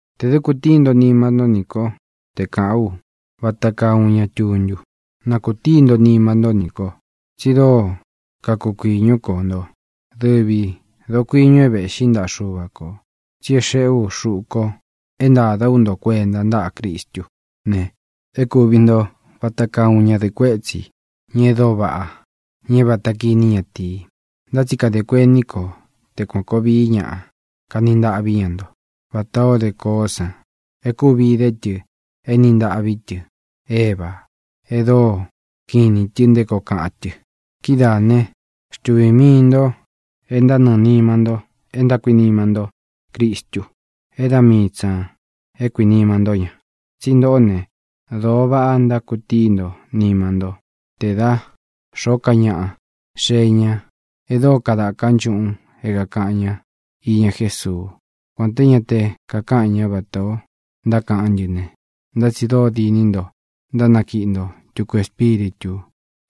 Tē dɨ́ kūtíi nto nima nto ní ko te kāꞌán u vata kaa uun ña tuntu. Na kūtíi nto nima nto ní ko. Tsi dóo kakukuiñú ko nto, dɨvi dokuīñu é vēꞌxí ntaꞌa Xuva kō, tsi é xeꞌé u xuꞌu ko é ntāda ú nto kuenta ntáꞌa Cristú ne, é kūvi nto vata kaa uun ñadɨꞌɨ kuétsi, ña e dóo vaꞌá, ña é vāta kiní ñatīi. Ntá tsi kadē kuení ko te kuān koo vií ñaꞌa kani ntaꞌví ña nto vatā o dé koó san e kúvi dé tɨ éni ntāꞌví tɨ Eva e dóo kiꞌin inī tɨ nté koo kaꞌan tɨ. Kidáā né, xtuvī mii nto e ntánɨɨ̄ nima nto e ntákuinima ntó Cristu, é da mii tsi ñā é kuinima ntó ña. Tsi ntoꞌó ne, dōo vaꞌa ntákutíi nto nima ntó te da xōó ka ñaꞌa xee ña e dóo kadaka nchuꞌūn é kākaꞌan ña iña Jésuu. Kuān té ña te kakáꞌan ña vatā ó ntákaꞌán ntɨ ne, ntá tsi dóo diní nto ntánakiꞌi nto tuku espíritū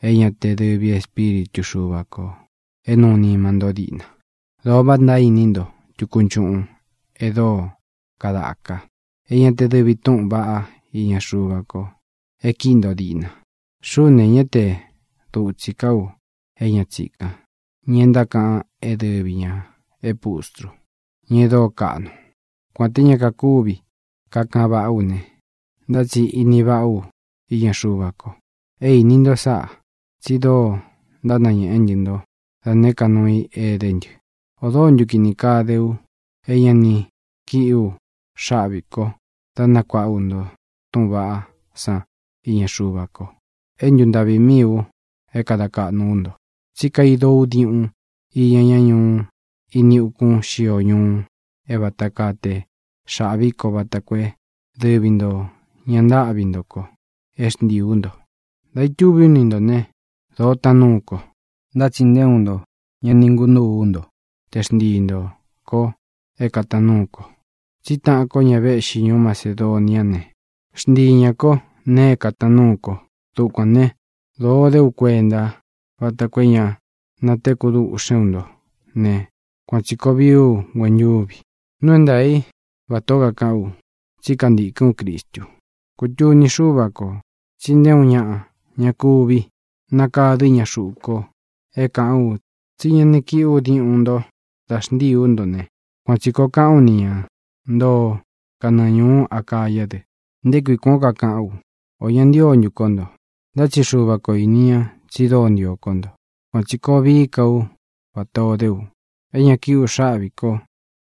é ñā te dɨvi Espíritu Xuva kō é nuu nima nto díꞌna. Dōo vaꞌa ntaíni nto tuku nchuꞌun e dóo kadaka, é ñā te dɨvi túꞌūn vaꞌá iña Xuva ko e kíꞌi nto díꞌna. Xuꞌú ne, ñá te dutsī ká u é ña tsīkan, ña e ntákaꞌan é dɨvi ñā é pustru, ña e dóo kaꞌnu. Kuān té ña kakuvi kakaꞌan váꞌa ú ne, ntá tsi ini váꞌa ú iña Xuva ko. É īni nto sáꞌa, tsi dóo ntánañēꞌé ntɨ nto da nēé ka nuu i é edé ntɨ. ¿Ō dóo ntu kini kaa dé u é ña ni kíꞌi u xáꞌvī ko dá nakuāꞌa ú nto túꞌūn vaꞌá san iña Xuva ko, é ntuntaꞌvi míi u dá kāda kaꞌnu ú nto? Tsí kaido ú diuꞌun iña ñá ñuꞌu ini ukún xio ñuu é vata kaa te xāꞌví ko vata koo é dɨvi ntō ña ntáꞌvi nto ko é xntiī ú nto. Dā itúvī ú ni ntō ne, dōo táan nuu ko, ntá tsi nté uun nto ña ni ngunúū ú nto te xntii ntō ko é kātaan núu ko, tsí taꞌan ko ña véꞌxi ñuú Macedoniá ne, xntii ñā kó nēe é kātaan núu ko. Dukuān né, dōo dé u kuenta vata koo é ña natekú duꞌxén u ntó ne, kuān tsi koo vií u nguentúvi. Nuu é ntaā í vatā ó kakaꞌán u, tsí kantīkɨ́n u Cristu. Kutuni Xúva kō tsi nté uun ñaꞌa ña kuvi nakadɨ́ ña xuꞌu ko é kāꞌán u tsí ña ni kíꞌi u diúꞌun ntō da xntíī ú nto ne, kuān tsi koo kaꞌán u ni ña ntoo kanɨɨ̄ ñuú Acayá dɨ. ¿Nté kui kuān ó kakaꞌán u? ¿Ō ña ntío ntu kó nto? Ntá tsi Xuva kō ini ña tsi dóo ntio kó nto. Kuān tsi koo vií ka ú vatā o dé u, é ña kíꞌi ú xaꞌvī ko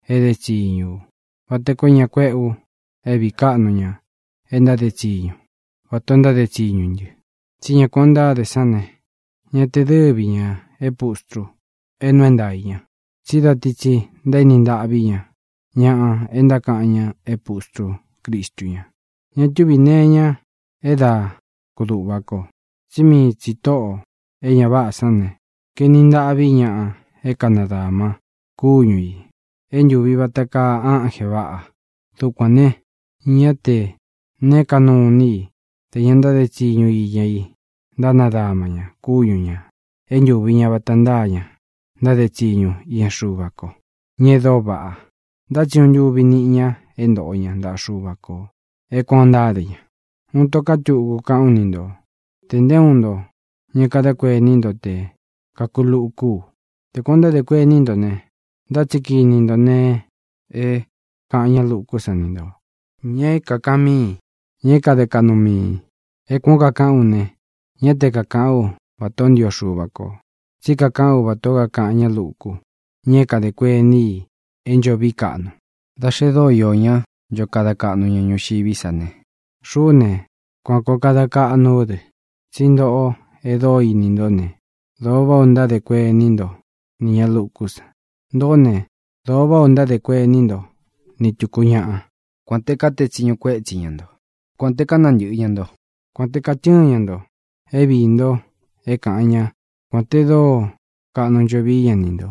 é edé tsiñu u, vata koo é ña kuéꞌe u é vīí kaꞌnu ña e ntáde tsiñu vatā o ntáde tsiñu ntɨ. Tsí ña kuān ó ntáde sán ne, ñá tē dɨ́vi ñā é pustru é nuu é ntaā í ña, tsí da ti tsi ntaéni ntaꞌví ña ñaꞌa e ntákaꞌan ña é pustrú Cristu ña. Ña túvī nee iña é da kuduꞌva kō, tsí mii tsī tóꞌō e ña váꞌā sán ne, kaeni ntaꞌví ñaꞌa é kānadama kúñu ī é ntūvi vata kaa ánjē vaꞌa. Dukuān ne, ñá tē neé kaꞌnu nuu i te ña ntáde tsiñu iña i ntánadama ña kúñu ñā é ntūvi ña vata ntáa ña ntáde tsiñu iña Xuva ko, ña e dóo vaꞌa. Ntá tsi uun ntuvi niꞌi ña é ntoꞌo ña ntaꞌa Xuva kō é kuān ó ntáde ña. Uun ito ká tuku kaꞌán u ni nto tē nté uun nto ña kadá kuení nto te kākulukú u. Te kuān o ntádē kuení nto ne, ntá tsi kiní nto nēe e káꞌan ña lukú sa ni ntō, ña é kākaꞌan míi, ña é kade kaꞌnu miī. É kuān ó kakaꞌán u ne, ñá te kakāꞌán u vatā ó ntio Xuva kō, tsí kakaꞌán u vatā ó kakaꞌan ña lúku, ña é kadē kuení i é ncho vií kaꞌnu. Da xe dóo iō ñá ncho kada kaꞌnu ñuxiví sa ne, xuꞌú ne, kuān koo kada kaꞌnú u dɨ. Tsí ntoꞌo e dóo ini ntó ne, dōo váꞌā ó ntádē kuení nto nī ña lukú san. Ntōꞌó ne, dōo váꞌā ó ntádē kuení nto ni tūku ñáꞌa, kuān te kátee tsiñu kuétsi ña nto, kuān te kánantɨ̄ꞌɨ́ ña nto, kuān te katɨ́ɨn ña ntō é viī nto é kāꞌan ñá, kuān te dóo kaꞌnu ncho vií ña ni ntō,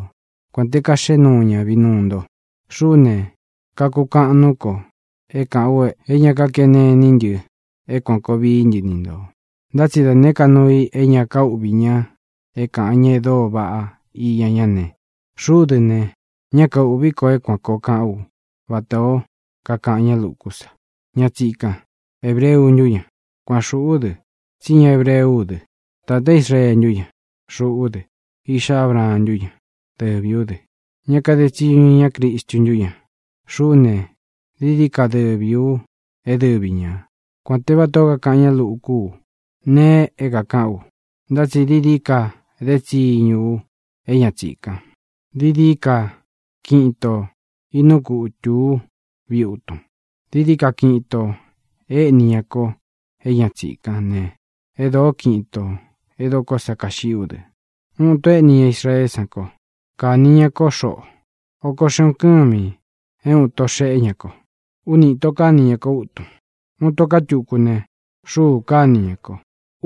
kuān te kaxeꞌé nuu ña vinuu nto. Xuꞌú ne, kakukaꞌan nuú ko é kāꞌán u e ña kákene iní ntɨ é kuān koo vií ntɨ ni ntō. Ntá tsi da nēé ka nuu i é ña kaúꞌvī ña é kāꞌan ña e dóo vaꞌá iña ñá ne, xuꞌú dɨ ne, ñá kaūꞌví ko é kuān koo kaꞌán u vatā ó kakaꞌan ña lukú sa. Ña tsīkán, ¿hebreu ntú ña? Kuān xuꞌú dɨ, tsí ña hebreu ú dɨ. ¿Tātá Israee ntú ña? Xuꞌú dɨ. ¿Iꞌxá Abraan ntú ña? Dɨvī ú dɨ. ¿Ña kade tsiñu iña Cristu ntú ña? Xuꞌú ne, dií dií ka dɨvī u é dɨvi ña, kuān te vata ó kakaꞌan ñá luku ú nee é kākaꞌán u. Ntá tsi dií dií ka éde tsiñu u é ña tsīkan. Dií dií ka kiꞌin itō inúu kutū ú viꞌi utun. Dií dií ka kiꞌin itō éꞌni ña ko é ña tsīkán ne, e dóo kiꞌin itō é dokó sa kaxiꞌí u dɨ. Úꞌun īto éꞌni ña Israeé san ko. Kāni ña kó xoꞌo. Oko xeꞌun kɨ́mi é uun ito xéꞌe ña ko. Úni īto káni ña kó utun. Uun ito ká tuku ne, xuu káni ña ko.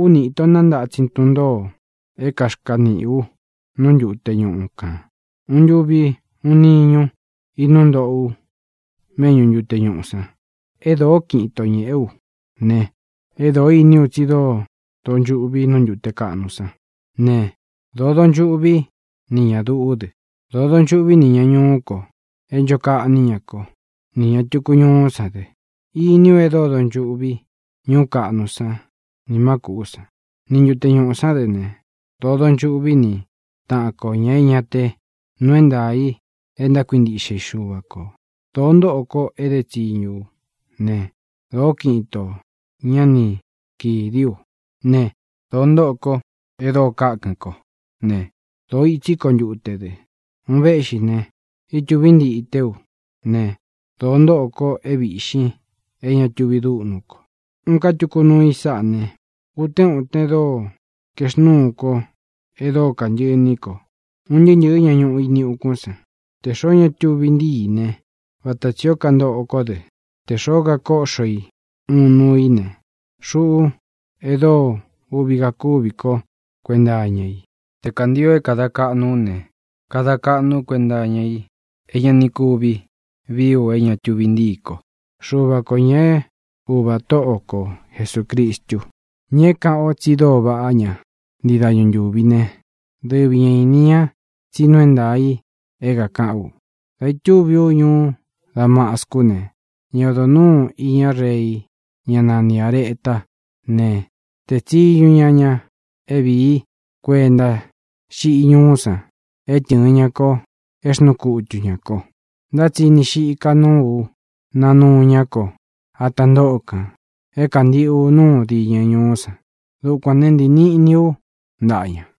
Úni īto nántatsin tun ntōo é kaxkaniꞌī u nú ntute ñuꞌu kān. Uun ntuvi, uun niñu inúu ntoꞌo u méꞌñu ntute ñuꞌū san. E dóo kiꞌin itō ñéꞌe ú ne, é dōo íní u tsi dóo donchuꞌvi nú ntute kaꞌnu sán ne, dōo donchuꞌví nī ña duꞌú dɨ; dōo donchuꞌví nī ña ñuú ko é ncho kaꞌní ña kó, nī ña tuku ñuú san dɨ. Iní u e dóo donchuꞌví ñuú kaꞌnu san nī má kūꞌú san, ni ntute ñuꞌū sán dɨ ne, dōo donchuꞌví ni tāꞌan ko, ña é ña te nuu é ntaā i e ntákuintiꞌxe i Xuva kō. Dōo ntóꞌo ko é dé tsiñu ú ne, dōó kiꞌin itō ña ni kídi ú ne, dōo ntóꞌo ko e dóo kákɨn kó ne, dōo itsí ko ntute dɨ. Un véꞌxi ne, ítūví ntité u ne, dōo ntóꞌo ko é vīꞌxin é ña tuvi dúꞌnú ko. Uun ká tuku nuu i sáꞌa ne: utén uten dóo kaexnúu kó e dóo kantɨꞌɨ iní ko un ntɨɨ́ ntɨ̄ɨ́ ña ñuꞌu ini ukún san. Tē xoó ña tuvi ntíi i ne, vata tsī ó kantoꞌo kó dɨ. Tē xoó kakóꞌxo i uun nuu i ne, xuꞌú e dóo uꞌvi kakúvi kó kuenta iña i. Te kāntio é kāda kaꞌnu ú ne, kada kaꞌnu ú kuenta iña i é ña ni kuvi vií u é ña tuvi ntíi ko. Xuva kō, ña é Uva Tóꞌo ko Jesūcristu, ña é kāꞌan o tsi dóo vaꞌá ña ntii dañu ntūvi ne, dɨvi ña īni ña tsí nuu é ntaā i é kākaꞌán u. Dā itúvi ú ñuú Damascú ne, ña odo nūú iña rei, ñá nani Āretá ne, tēe tsiñu ña ña é vīí kuenta xiꞌí ñuú san é tɨ̄ɨn ña ko é xnuu kutu ñā ko. Ntá tsi ini xika núu ú, nanúu ñá ko ata ntóꞌo kān é kāntiꞌu núu diñɨ ñuú san. Dukuān né, ntīi niꞌni ú ntaꞌa ña.